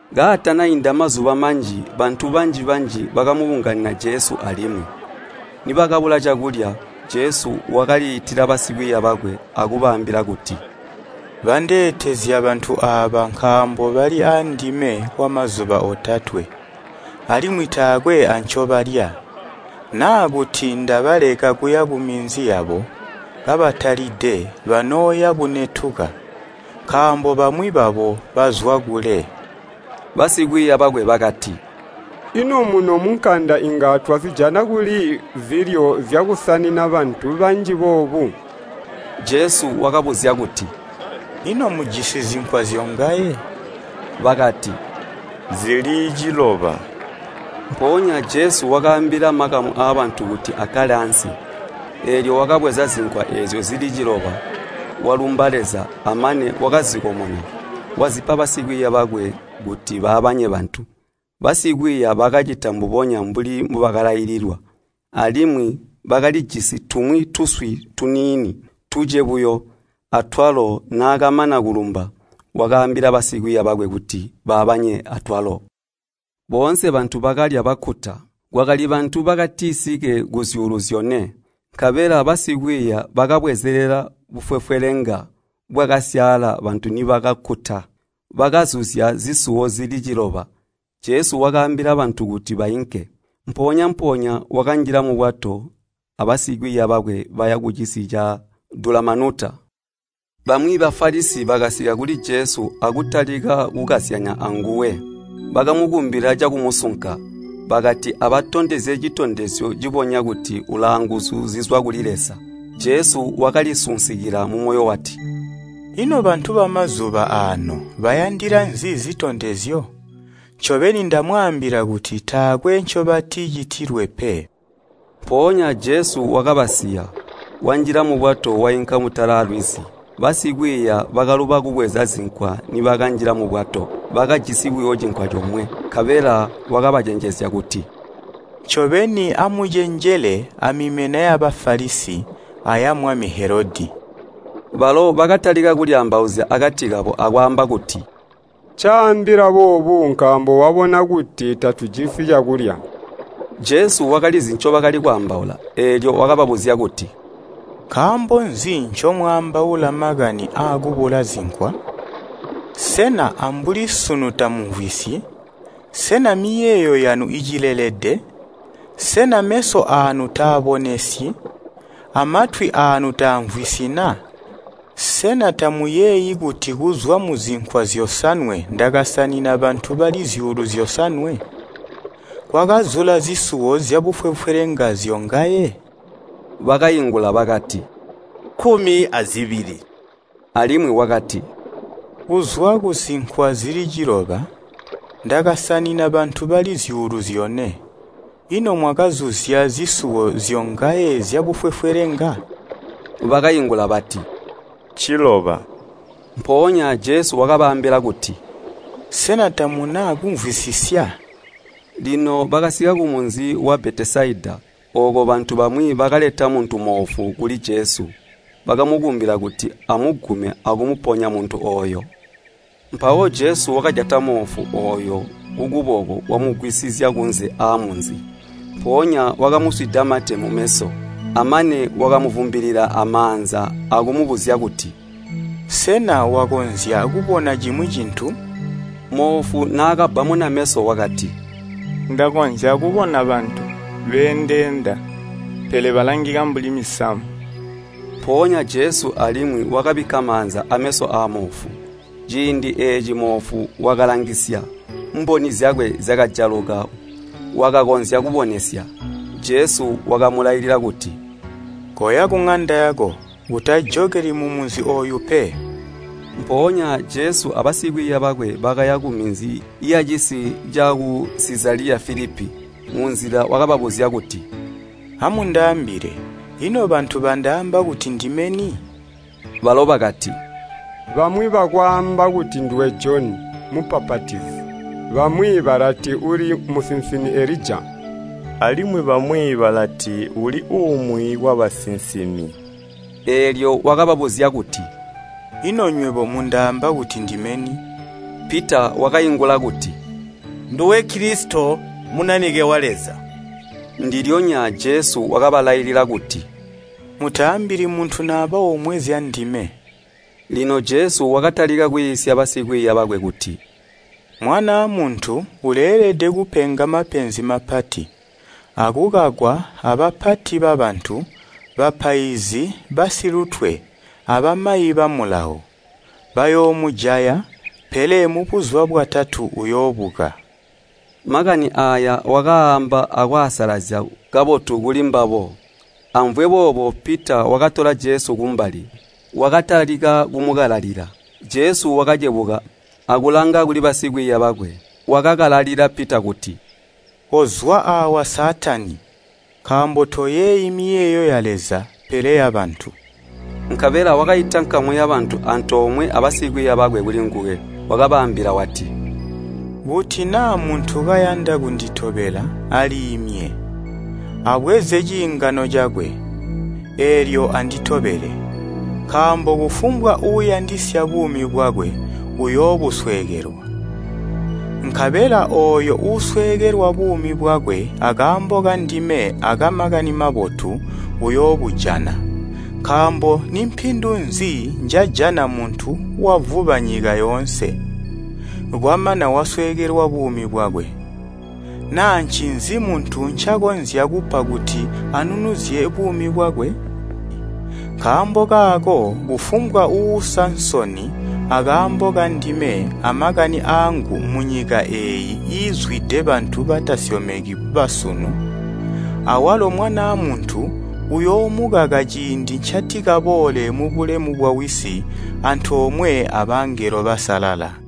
Kaatanainda mazuba manji bantu banji-banji bakabunganina Jesu alimwi. Nibakabula cakulya, Jesu wakaliitila basikwiiya bakwe akubaambila kuti, “Bandeetezya bantu aaba nkaambo bali aandime kwamazuba otatwe, alimwi taakwe ancobalya. Naa kuti ndabaleka kuya kuminzi yabo kabatalide, banooya bunetuka, nkaambo bamwi babo bazwa kule.” Basikwiiya bakwe bakati, “Ino muno munkanda inga twazijana kuli zilyo zyakusanina bantu banji boobu?” Jesu wakabuzya kuti, “Ino mujisi zinkwa zyongaye?” Bakati “Zili ciloba.” Mpoonya Jesu wakaambila makamu aabantu kuti akkale ansi. Eelyo wakabweza zinkwa eezyo zili ciloba, walumba Leza, amane wakazikomona, wazipa basikwiiya bakwe kuti baabanye bantu, basikwiiya bakacita mbubonya mbuli mbubakalaililwa. Alimwi bakalijisi tumwi tuswi tuniini, tuce buyo, atwalo naakamana kulumba, wakaambila basikwiiya bakwe kuti babaabanye atwalo. Boonse bantu bakalya bakkuta. Kwakali bantu bakatisike kuzyuulu zyone. Nkabela basikwiiya bakabwezelela bufwefwelenga bwakasyaala bantu nibakakkuta. Bakazuzya zisuwo zili ciloba. Jesu wakaambila bantu kuti bainke. Mpoonya-mpoonya wakanjila mubwato abasikwiiya bakwe baya kucisi ca Dulamanuta. Bamwi Bafalisi bakasika kuli Jesu akutalika kukazyanya anguwe. Bakamukumbila cakumusunka, bakati abatondezye citondezyo cibonya kuti ulaanguzu zizwa kuli Leza. Jesu wakalisinsukila mumoyo wati, “Ino bantu bamazuba aano bayandila nzi zitondezyo? Ncobeni ndamwaambila kuti taakwe ncobaticitilwe pe.” Mpoonya Jesu wakabasiya, wanjila mubwato wainka mutala lwizi. Basikwiiya bakaluba kubweza zinkwa nibakanjila mubwato, bakajisi buyo cinkwa comwe. Nkabela wakabacenjezya kuti, “Ncobeni, amucenjele amimena ya Bafalisi aya mwami Helodi.” Balo bakatalika kulyaambauzya akati kabo akwaamba kuti, “Ncaambila boobu nkaambo wabona kuti tatujisi cakulya.” Jesu wakalizi ncobakali kwaambaula, eelyo wakababuzya kuti, “Nkaambo nzi ncomwaambaula makani aakubula zinkwa? Sena ambuli sunu tamumvwisyi? Sena miyeeyo yanu icilelede? Sena meso aanu taabonesyi? Amatwi aanu taamvwisyi na? Sena tamuyeeyi kuti kuzwa muzinkwa zyosanwe ndakasanina bantu bali zyuulu zyosanwe? Kwakazula zisuwo zyabufwefwelenga zyongaye?” Bakaingula bakati, “Kkumi azibili.” ALimwi wakati, “Kuzwa kuzinkwa zili ciloba, ndakasanina bantu bali zyuulu zyone, ino mwakazuzya zisuwo zyongaye zyabufwefwelenga?” Bakaingula bati, “Nciloba.” Mpoonya Jesu wakabaambila kuti, “Sena tamuna kumvwisisya?” Lino bakasika kumunzi wa Betesaida. Ooko bantu bamwi bakaleta muntu moofu kuli Jesu, bakamukumbila kuti amugume akumuponya muntu ooyo. Mpawo Jesu wakajata moofu ooyo kukuboko wamugwisizya kunze aamunzi. Mpoonya wakamuswida mate mumeso, amane wakamuvumbilila amaanza akumubuzya kuti, “Sena wakonzya kubona cimwi cintu?” Moofu naakabbamuna meso wakati, “Ndakonzya kubona bantu beendeenda, pele balangika mbuli misamu.” Mpoonya Jesu alimwi wakabikka maanza ameso aamoofu. Ciindi eeci moofu wakalangisya, mboni zyakwe zyakajaluka, wakakonzya kubonesya. Jesu wakamulailila kuti, “Koya kuŋanda yako, utajokeli mumunzi ooyu pe.” Mpoonya Jesu abasikwiiya bakwe bakaya kuminzi yacisi caku Sizaliya Filipi. Munzila wakababuzya kuti, “Amundaambile, ino bantu bandaamba kuti ndime ni?” Balo bakati, “Bamwi bakwaamba kuti nduwe Joni Mubbapatizi, bamwi balati uli musinsimi Elija, alimwi bamwi balati uli umwi wabasinsimi.” Eelyo wakababuzya kuti, “Ino nywebo, mundaamba kuti ndime ni?” Pita wakaingula kuti, “Nduwe Kilisito, Munanike wa Leza.” Ndilyonya Jesu wakabalailila kuti, “Mutaambili muntu naba omwe zyandime.” Lino Jesu wakatalika kwiisya basikwiiya bakwe kuti, “Mwanaa Muntu uleelede kupenga mapenzi mapati, akukakwa abapati babantu, bapaizi basilutwe, abamayi ba Mulawo. Bayoomujaya, pele mubuzuba bwatatu uyoobuka.” Makani aaya wakaaamba akwaasalazya kabotu kulimbabo. Amvwe boobo Pita wakatola Jesu kumbali, wakatalika kumukalalila. Jesu wakacebuka akulanga kuli basikwiiya bakwe, wakakalalila Pita kuti, “Kozwa aawa Saatani, nkaambo toyeeyi miyeeyo ya Leza, pele yabantu!” Nkabela wakaita nkamu yabantu antoomwe abasikwiiya bakwe kulinguwe. Wakabaambila wati, “Kuti naa muntu kayanda kunditobela aliimye, abweze ciingano cakwe, eelyo anditobele. Nkaambo kufumbwa uuyandisya buumi bwakwe, uyoobuswekelwa, nkabela ooyo uusweekelwa buumi bwakwe akaambo kandime aka Makani Mabotu, uyoobujana. Nkaambo nimpindu nzi njajana muntu wavuba nyika yoonse, kwamana wasweekelwa buumi bwakwe? Naa ncinzi muntu ncakonzya kupa kuti anunuzye buumi bwakwe? Nkaambo kaako kufumbwa uuusa nsoni akaambo kandime amakani aangu munyika eeyi iizwide bantu batasyomeki basunu, awalo Mwanaa Muntu uyoomukaka ciindi ncatikaboole mubulemu bwawisi antoomwe abangelo basalala.”